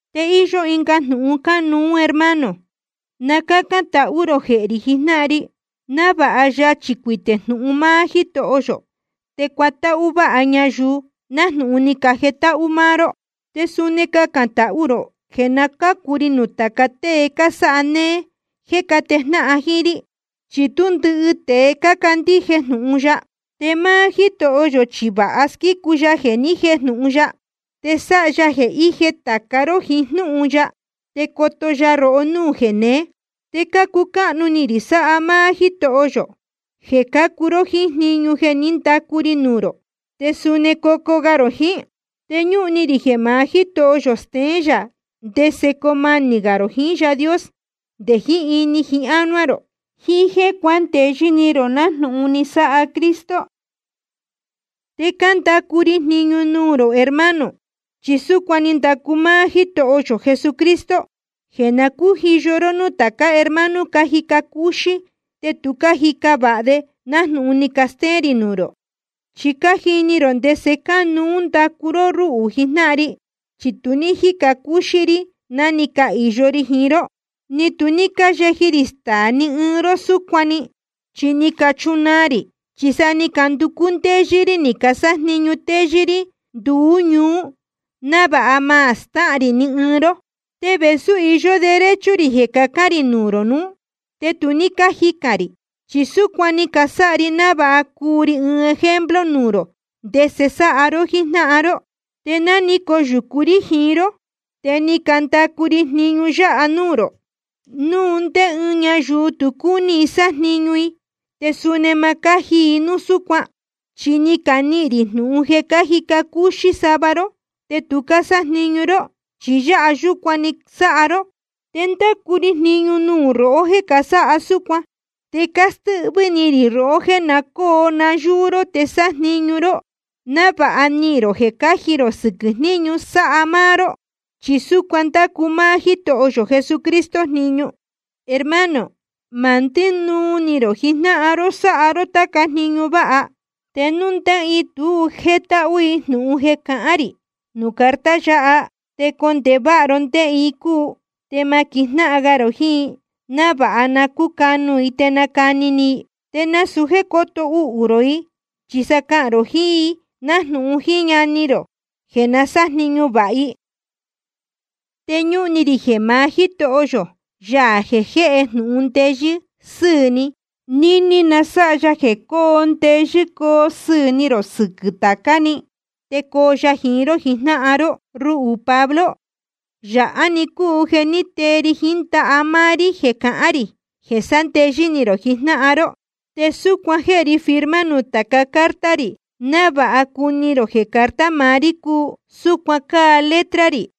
Te íyó ɨnga jnūhun cánuú, hermano. Na cácán tahú rō jehē rī jijnáhan ri, návāha yachī cuitē núu jnūhun máá Jítoho yō, te cuatáhú váha ñayuu, nájnūhun ni cajetáhú máá ró. Te suni cacān tahú rō jeē na cácu ri nuū tāca tée cásáha néé jéē cátejnáhan jíín rí. Chi tú ndɨhɨ tēe cácandíje jnūhun ya. Te máá Jítoho yō chi vāha squícu ya jeē ni jéjnūhun ya, te sáha ya jeē íje ni tāca ró jiín jnúhun ya, te coto ya rohó núū jeneé. Te cácucáhnu ni rī sáha máá Jítoho yō, jeē cócuu ró jíín jniñu jeē ní candacu ri nuū rō, te suni cocuu ga rō jiín. Te ñúhun ni rī jeē maá Jítoho yō steén gā yā ndese coo manī gā rō jiín Yaā Dios nde jiín ini jiín ánuá rō, jiín jéē cuándeyɨ́ ni rō nájnūhun ni sáha Cristo. Te cándacu ri jniñu nuū rō hermano, chi súcuan ni ndacu máá Jítoho yō Jesucristo, jeē na cújiyo ró núū tācá hermano cájica cúxí te tu cájica vāha de nájnūhun ni castéén rī nuū rō. Chi je cájini rō ndese cánuú ndacu ró rúhū jijnáhan ri, chi tu ní cájica cúxí rí ná ni cahīyo ri jiín ró. Ni tu ní cáyeji rī staā ni ɨɨn ró súcuan‑ni, chi ni cachunaa rī. Chi sa ni canducú ndéyɨ́ rí ni casájniñu téyɨ́ rí nduú ñuú, návāha ma stáhān rī ni ɨɨn ró. Te vēsú íyó derecho rī jeē cacán rī nuū rō nuú, te tu ní cájicān rī, chi súcuan ni casáha ri návāha cuu ri ɨɨn ejemplo nuū rō ndese sáha ró jíjnáhan ró. Chi ná ni coyūcu rí jiín ró, te ni candacu ri jniñu yáha nuū rō: Núu ndé ɨɨn ñayuu tu cúní i sájniñu i, te suni ma cáji i núu súcuan. Chi ni canihīn rī jnūhun jeē cájica cúxí sava ró, te tu cásájniñu ró, chi yāha yúcuan‑ni sáha ró. Te cándacu ri jniñu nuū rohó jéē casáha súcuan, te cástɨ́hvɨ́ ni rī rohó jeē na cóo nayúú ró te sájniñu ró, návāha nihīn rō jeē cáji rō sɨquɨ̄ jníñu sáha máá ró. Chi súcuan ndácu máá Jítoho yō Jesucristo jniñu. Hermano, ma ndínuu ni rō jijnáhan ró sáha ró táca jniñu váha. Te núu ndé ɨɨn i tu jétáhú i jnūhun jeē cahán rī nuū carta yáha, te condēhe váha ro ndé‑ni i cúu, te ma quijnáhan ga rō jiín i, návāha na cúcanu i te nacani ni i. Te nasūu jéē cóto uhū rō i, chi sa cahān rō jiín i nájnūhun jíín ñani rō jeē na sájniñu vāha i. Te ñúhun ni rī jeē maá Jítoho yō, Yaā jeē jéhe jnūhun ndeyɨ́ sɨ́ɨ̄ ni, níní na sáha ya jeē coo ndeyɨ́ coo sɨɨ̄ ni rō sɨquɨ̄ tācá‑ni, te coo ya jiín ró jijnáhan ró. Ruhū Pablo, yāhá‑ni cúu jeē tée ri jiín ndaha máá rí jeē cahán rī jeē sándeyɨ́ ni rō jijnáhan ró. Te súcuan jéhe ri firma nuū tāca carta rī, návāha cuni rō jeē carta maá rí cúu. Súcuan cáa letra rī.